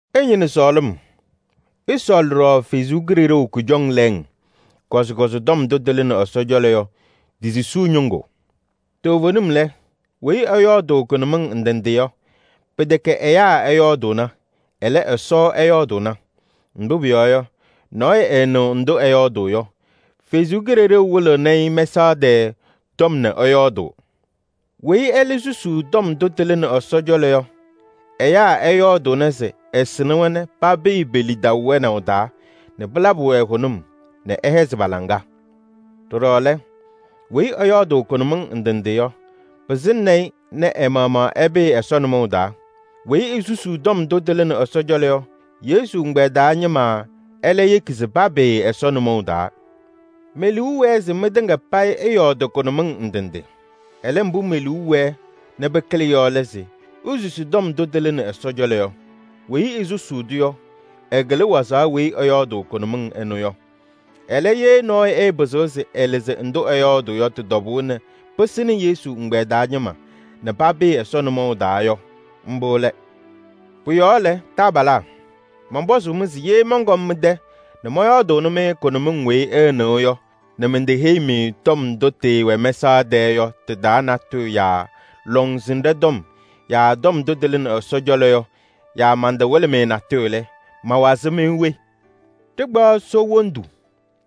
Ɩñɩnɩ sɔɔlɩm. Ɩsɔɔlɩ ɖɔɖɔ Ɛsɔ Kalɩzaɣ kʋjɔŋ lɛɛŋ, kɔzɩkɔzɩ tɔm ndʋ tɩlɩnɩ Ɛsɔ cɔlɔ yɔ ti-susuu ñɩŋgʋ. Toovenim lɛ, weyi ɛyɔɔdʋʋ kʋnʋmɩŋ ndɩ ndɩ yɔ, pɩtɛkɛ ɛyaa ɛyɔɔdʋʋna, ɛlɛ, Ɛsɔ ɛyɔɔdʋʋna. Mbʋ pʋyɔɔ yɔ, nɔɔyʋ ɛɛnɩɣ ndʋ ɛyɔɔdʋʋ yɔ. Ɛsɔ Kalɩzaɣ wɩlɩɣnɩ-ɩ mɛsaɣ tɛɛ tɔm nɛ ɛyɔɔdʋʋ. Weyi ɛlɛ susuu tɔm ndʋ tɩlɩnɩ Ɛsɔ cɔlɔ yɔ, ɛyaa ɛyɔɔdʋʋnɩ se ɛsɩnɩ-wɛ nɛ papɩɩ pe-lidaʋ wɛnaʋ taa nɛ pɩlabɩ-wɛ hʋnʋm nɛ ɛhɛzɩ pa-laŋa. Ɖɔɖɔ lɛ, weyi ɛyɔɔdʋʋ kʋnʋmɩŋ ndɩ ndɩ yɔ, eyeki se ɛ-maɣmaɣ ɛpɩɩ Ɛsɔ nʋmɔʋ taa. Weyi esusuu tɔm ndʋ tɩlɩnɩ Ɛsɔ cɔlɔ yɔ, Yesu ɛgbɛyɛ taa ñɩma ɛlɛ yeki se papɩɩ Ɛsɔ nʋmɔʋ taa. Me-liu wɛɛ se mɩtɩŋa payɩ ɩyɔɔdɩ kʋnʋmɩŋ ndɩ ndɩ. Ɛlɛ, mbʋ me-liu wɛɛ nɛ pɩkɩlɩ yɔ lɛ se isusi tɔm ndʋ tɩlɩnɩ Ɛsɔ cɔlɔ yɔ. Weyi esusuu-tʋ yɔ, ɛkɩlɩ wazaɣ weyi ɛyɔɔdʋʋ kʋnʋmɩŋ ɩnʋ yɔ. Ɛlɛ, ye nɔɔyʋ ɛpɩzɩɣ se ɛlɩzɩ ndʋ ɛyɔɔdʋʋ yɔ tɩ-tɔbʋʋ nɛ pɩsɩnɩ Yesu ɛgbɛyɛ taa ñɩma nɛ papɩɩ Ɛsɔ nʋmɔʋ taa yɔ, mbʋ lɛ. Pʋ-yɔɔ lɛ, taabalaa, mɔnpɔzʋʋ-mɩ se: ye mɔnkɔm mɩ-tɛ nɛ mɔyɔɔdʋʋnɩ-mɩ kʋnʋmɩŋ weyi ɩɩnɩɣ yɔ nɛ menteheyi-mɩ tɔm ndʋ tɩɩwɛ mɛsaɣ tɛɛ yɔ tɩ-taa natʋyʋ yaa lɔŋsɩnɖɛ tɔm yaa tɔm ndʋ tɩlɩnɩ Ɛsɔ cɔlɔ yɔ yaa mantawɩlɩ-mɩ natʋyʋ lɛ, mawazɩ-mɩ we? Ɖɩkpaɣ soo wondu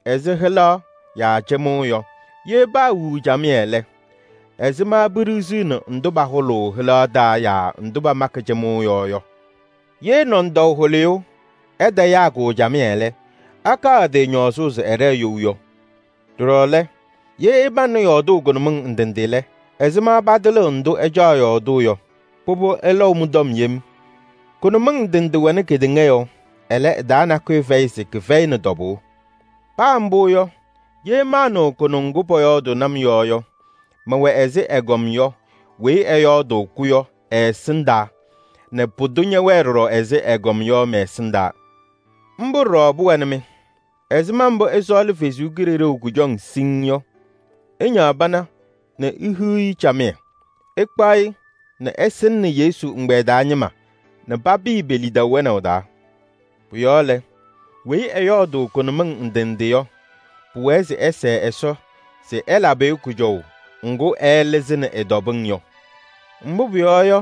ɛzɩ hɩlaɣ yaa cɩmʋʋ yɔ: ye paawiɣ camɩyɛ lɛ, ɛzɩma peɖiɣziɣni ndʋ pahʋlʋʋ hɩlaɣ taa yaa ndʋ pamakɩ cɩmʋʋ yɔɔ yɔ? Ye nɔndɔʋ hʋlɩyʋ ɛtayaa-kʋ camɩyɛ lɛ, akaɣ ɛ-tɩ ñɔɔzʋʋ se ɛɖɛɛ you yɔ? Ɖɔɖɔ lɛ, ye ɩpaŋnɩ yɔɔdʋʋ kʋnʋmɩŋ ndɩ ndɩ lɛ, ɛzɩma patɩlɩɣ ndʋ ɩcaɣ yɔɔdʋʋ yɔ? Pʋbʋ ɩlɔʋ mɩ-tɔm yem. Kʋnʋmɩŋ ndɩ ndɩ wɛnɩ kedeŋa yɔɔ. Ɛlɛ, ɩ-taa nakʋyʋ fɛyɩ se kɩfɛyɩnɩ tɔbʋʋ. Paa mbʋ yɔ, ye maanɩɣ kʋnʋŋ ŋgʋ pɔyɔɔdʋʋnɩ-m yɔ yɔ, mɛwɛ ɛzɩ ɛgɔm yɔ weyi ɛyɔɔdʋʋ-kʋ yɔ ɛ-ɛsɩndaa nɛ pʋdʋ ñɛwɛɛ ɖɔɖɔ ɛzɩ ɛgɔm yɔ mɛ-ɛsɩndaa. Mbʋ ɖɔɖɔ pʋwɛnɩ-mɩ. Ɛzɩma mbʋ ɩsɔɔlɩ Ɛsɔ Kalɩzaɣ kʋjɔŋ siŋŋ yɔ, ɩñaɣ pana nɛ ihiɣ-i camɩyɛ. Ɩkpaɣ-ɩ nɛ ɩsɩnɩnɩ Yesu ɛgbɛyɛ taa ñɩma nɛ papɩɩ pe-lidaʋ wɛnaʋ taa. Pʋ-yɔɔ lɛ, weyi ɛyɔɔdʋʋ kʋnʋmɩŋ ndɩ nɖɩ yɔ, pʋwɛɛ se ɛsɛɛ Ɛsɔ se ɛlabɩ-ɩ kʋjɔʋ ŋgʋ ɛɛlɩzɩnɩ ɩ-tɔbɩŋ yɔ. Mbʋ pʋyɔɔ yɔ,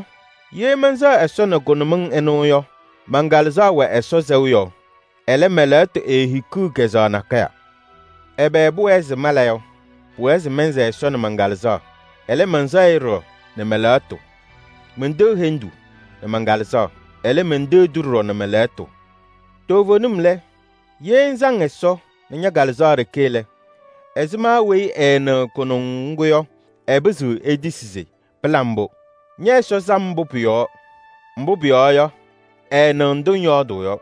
ye mɛnsɛɣ Ɛsɔ nɛ kʋnʋmɩŋ ɩnʋ yɔ, man-Kalɩzaɣ wɛ Ɛsɔ sɛʋ yɔɔ. Ɛlɛ, mɛ-lɛɣtʋ eehikiɣ kazʋwa nakɛyɛ. Ɛbɛ pʋwɛɛ se mala yɔ? Pʋwɛɛ se mɛnsɛɛ Ɛsɔ nɛ man-Kalɩzaɣ. Ɛlɛ, mɛnsɛɣ-ɩ ɖɔɖɔ nɛ mɛ-lɛɣtʋ. Menteɣ hendu nɛ man-Kalɩzaɣ. Ɛlɛ, menteɣ-tʋ ɖɔɖɔ nɛ mɛ-lɛɣtʋ. Toovenim lɛ, ye ŋsaŋ Ɛsɔ nɛ ña-Kalɩzaɣ ɖeke lɛ, ɛzɩma weyi ɛɛnɩɣ kʋnʋŋ ŋgʋ yɔ, ɛpɩzɩɣ etisi se: pɩla mbʋ! Ñɛ-Ɛsɔ sam mbʋ pʋ-yɔɔ? Mbʋ pʋyɔɔ yɔ, ɛɛnɩɣ ndʋ ŋyɔɔdʋʋ yɔ.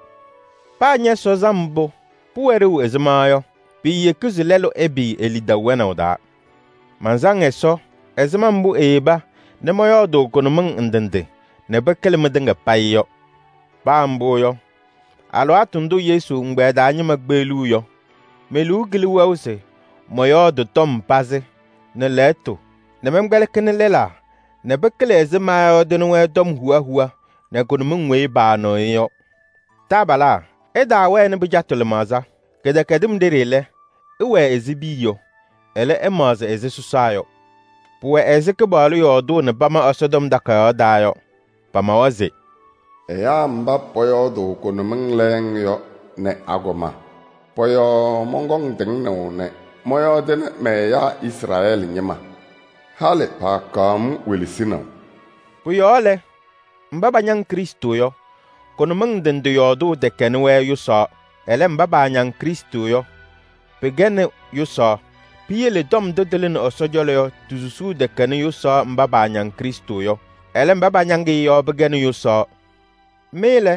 Paa ñɛ-Ɛsɔ sam mbʋ pʋwɛ ɖeu ɛzɩma yɔ, piiyeki se lɛlʋ ɛpɩɩ e-lidaʋ wɛnaʋ taa. Mansaŋ Ɛsɔ ɛzɩma mbʋ eyeba nɛ mɔyɔɔdʋʋ kʋnʋmɩŋ ndɩ ndɩ nɛ pɩkɩlɩ mɩtɩŋa payɩ yɔ. Paa mbʋ yɔ, alɩwaatʋ ndʋ Yesu ɛgbɛyɛ taa ñɩma kpeɣliɣ yɔ, me-liu kɩlɩ wɛʋ se mɔyɔɔdɩ tɔm pazɩ nɛ lɛɣtʋ nɛ mɛnkpɛlɩkɩnɩ lɛlaa nɛ pɩkɩlɩ ɛzɩ maayɔɔdɩnɩ-wɛ tɔm huwa huwa nɛ kʋnʋmɩŋ weyi paanɩɣ-ɩ yɔ. Taabalaa, ɩtaawɛnɩ pɩcatʋ lɩmaɣza. Kɩdɛkɛdɩm ɖeɖe lɛ, ɩwɛɛ ɛzɩ piya yɔ. Ɛlɛ, ɩmaɣzɩ ɛzɩ sɔsaa yɔ. Pʋwɛ ɛzɩ Kɩpaɣlʋ yɔɔdʋʋ nɛ pama Ɛsɔtɔm Takayaɣ taa yɔ. Pamawa se: “Ɛyaa mba pɔyɔɔdʋʋ kʋnʋmɩŋ lɛɛŋ yɔ nɛ agɔma, pɔ-yɔɔ mɔnkɔŋ tɩŋnaʋ nɛ mɔyɔɔdɩnɩ mɛ-ɛyaa. Halɩ paakaɣ-m welesinaʋ.” Pʋ-yɔɔ lɛ, mba pañaŋ Krɩstʋ yɔ, kʋnʋmɩŋ ndɩ ndɩ yɔɔdʋʋ tɛkɛnɩ-wɛ yʋsaɣ. Ɛlɛ, mba paañaŋ Krɩstʋ yɔ pɩkɛnɩ yʋsaɣ. Piyele tɔm ndʋ tɩlɩnɩ Ɛsɔ cɔlɔ yɔ ti-susuu tɛkɛnɩ yʋsaɣ mba paañaŋ Krɩstʋ yɔ. Ɛlɛ, mba pañaŋ-ɩ yɔ pɩkɛnɩ yʋsaɣ. Mɩ lɛ,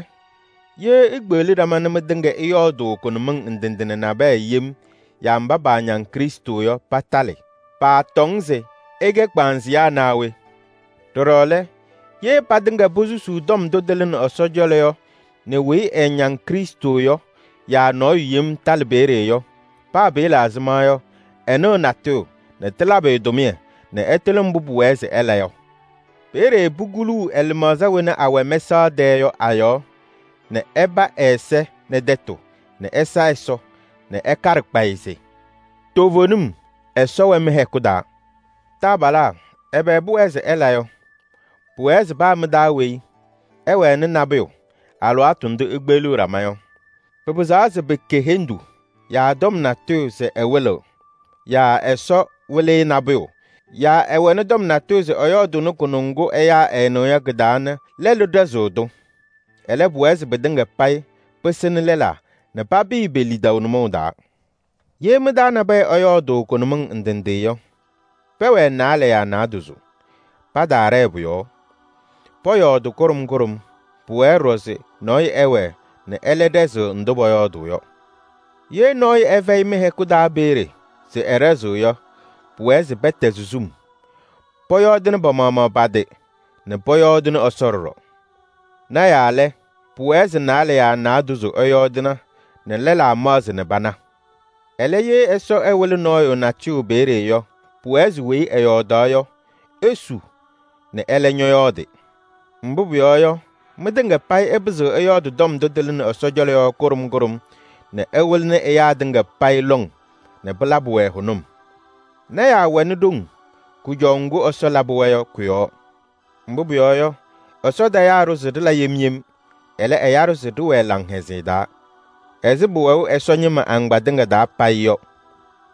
ye ikpeɣli ɖama nɛ mɩtɩŋa ɩyɔɔdʋʋ kʋnʋmɩŋ ndɩ ndɩ nɛ nabɛyɛ yem yaa mba paañaŋ Krɩstʋ yɔ patalɩ, paatɔŋ se ɩkɛ kpaaŋzɩyaa naa we? Ɖɔɖɔ lɛ, ye patɩŋa posusuu tɔm ndʋ tɩlɩnɩ Ɛsɔ cɔlɔ yɔ nɛ weyi ɛɛñaŋ Krɩstʋ yɔ yaa nɔɔyʋ yem talɩ peeye yɔ, paa pɩɩla ɛzɩma yɔ, ɛnɩɣ natʋyʋ nɛ tɩlabɩ-ɩ tʋmɩyɛ nɛ ɛtɩlɩ mbʋ pʋwɛɛ se ɛla yɔ. Peeye pukuluu ɛ-lɩmaɣza wena awɛ mɛsaɣ tɛɛ yɔ a-yɔɔ nɛ ɛpa ɛ-ɛza nɛ tɛtʋ nɛ ɛsa Ɛsɔ nɛ ɛkaɖɩ kpayɩ se: “Toovenim, Ɛsɔ wɛ mɩ-hɛkʋ taa.” Taabalaa, ɛbɛ pʋwɛɛ se ɩla yɔ? Pʋwɛɛ se paa mɩ-taa weyi ɛwɛnɩ nabʋyʋ alɩwaatʋ ndʋ ikpeɣliɣ ɖama yɔ. Pɩpɩzaɣ se pɩkɛ hendu yaa tɔm natʋyʋ se ɛwɩlɩɣ yaa Ɛsɔ wɩlɩ-ɩ nabʋyʋ yaa ɛwɛnɩ tɔm natʋyʋ se ɛyɔɔdʋʋnɩ kʋnʋŋ ŋgʋ ɛyaa ɛɛnɩɣ yɔ kɩ-taa nɛ lɛlʋ ɖɛzɩɣ-tʋ. Ɛlɛ, pʋwɛɛ se pɩtɩŋa payɩ pɩsɩnɩ lɛlaa nɛ papɩɩ pe-lidaʋ nʋmɔʋ taa. Ye mɩ-taa nabɛyɛ ɛyɔɔdʋʋ kʋnʋmɩŋ ndɩ ndɩ yɔ, pɛwɛɛ naalɛ yaa naadozo, pataaɖɛɛ pʋ-yɔɔ. Pɔyɔɔdɩ kʋɖʋm kʋɖʋm. Pʋwɛɛ ɖɔɖɔ se nɔɔyʋ ɛwɛɛ nɛ ɛlɛ ɖɛzɩɣ ndʋ pɔyɔɔdʋʋ yɔ. Ye nɔɔyʋ ɛfɛyɩ mɩ-hɛkʋ taa peeye se ɛɖɛzɩɣ yɔ, pʋwɛɛ se pɛtɛzɩ sum. Pɔyɔɔdɩnɩ pa-maɣmaɣ pa-tɩ nɛ pɔyɔɔdɩnɩ Ɛsɔ ɖɔɖɔ. Lɔɔyɩsɩ tɩnaa lɛ, pʋwɛɛ se naalɛ yaa naadozo ɛyɔɔdɩna nɛ lɛlaa maɣzɩ nɛ pana. Ɛlɛ, ye Ɛsɔ ɛwɩlɩ nɔɔyʋ natʋyʋ peeye yɔ, pʋwɛɛ se weyi ɛyɔɔdaɣ yɔ esu nɛ ɛlɛ ñɔyɔɔdɩ. Mbʋ pʋyɔɔ yɔ, mɩtɩŋa payɩ ɩpɩzɩɣ ɩyɔɔdɩ tɔm ndʋ tɩlɩnɩ Ɛsɔ cɔlɔ yɔ kʋɖʋm kʋɖʋm nɛ ɩwɩlɩnɩ ɛyaa tɩŋa payɩ lɔŋ nɛ pɩlabɩ-wɛ hʋnʋm. Lɔɔyɩsɩ tɩnaa wɛnɩ ɖoŋ kʋjɔʋ ŋgʋ Ɛsɔ labɩ-wɛ yɔ kʋ-yɔɔ. Mbʋ pʋyɔɔ yɔ, Ɛsɔ tayaa-ɖʋ se ɖɩla yem yem, ɛlɛ, ɛya-ɖʋ se ɖɩwɛɛ laŋhɛzɩyɛ taa. Ɛzɩ pʋwɛʋ Ɛsɔ ñɩma agbaa tɩŋa taa payɩ yɔ,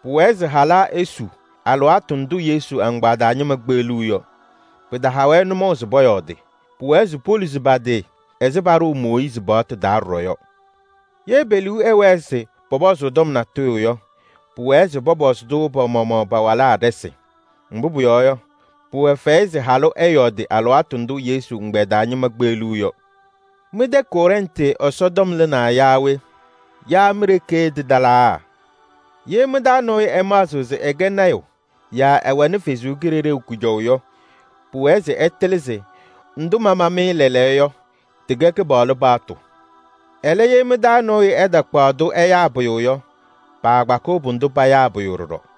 pʋwɛɛ se halaa esu alɩwaatʋ ndʋ Yesu agbaa taa ñɩma kpeɣliɣ yɔ. Pɩtaha-wɛ nʋmɔʋ se pɔyɔɔdɩ. Pʋwɛɛ se poluzi pa-tɩ ɛzɩ paɖʋʋ Mooyiizi paɣtʋ taa ɖɔɖɔ yɔ. Ye pe-liu ɛwɛɛ se pɔpɔzʋʋ tɔm natʋyʋ yɔ, pʋwɛɛ se pɔpɔzɩ-tʋ pa-maɣmaɣ pa-walaa ɖɩsɩ. Mbʋ pʋyɔɔ yɔ, pʋwɛ fɛyɛ se halʋ ɛyɔɔdɩ alɩwaatʋ ndʋ Yesu ɛgbɛyɛ taa ñɩma kpeɣliɣ yɔ. Mɩ-tɛ Kɔrɛntɩ Ɛsɔtɔm lɩnaa yaa we? Yaa mi-ɖeke tɩtalaa? Ye mɩ-taa nɔɔyʋ ɛmaɣzɩɣ se ɛkɛ lɔɔyaɣ tʋ yaa ɛwɛnɩ Ɛsɔ Kalɩzaɣ kʋjɔʋ yɔ, pʋwɛɛ se ɛtɩlɩ se ndʋ mama-mɩ lɛɛlɛɛyɔ yɔ, tɩkɛ Kɩpaɣlʋ paɣtʋ. Ɛlɛ, ye mɩ-taa nɔɔyʋ ɛtakpaɣ-tʋ ɛyaa pʋyʋ yɔ, paakpakɩɣ pʋdʋ payaa pʋyʋ ɖɔɖɔ.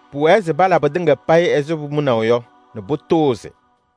Pʋwɛɛ se pala pɩtɩŋa payɩ ɛzɩ pʋmʋnaʋ yɔ nɛ pʋtʋʋzɩ.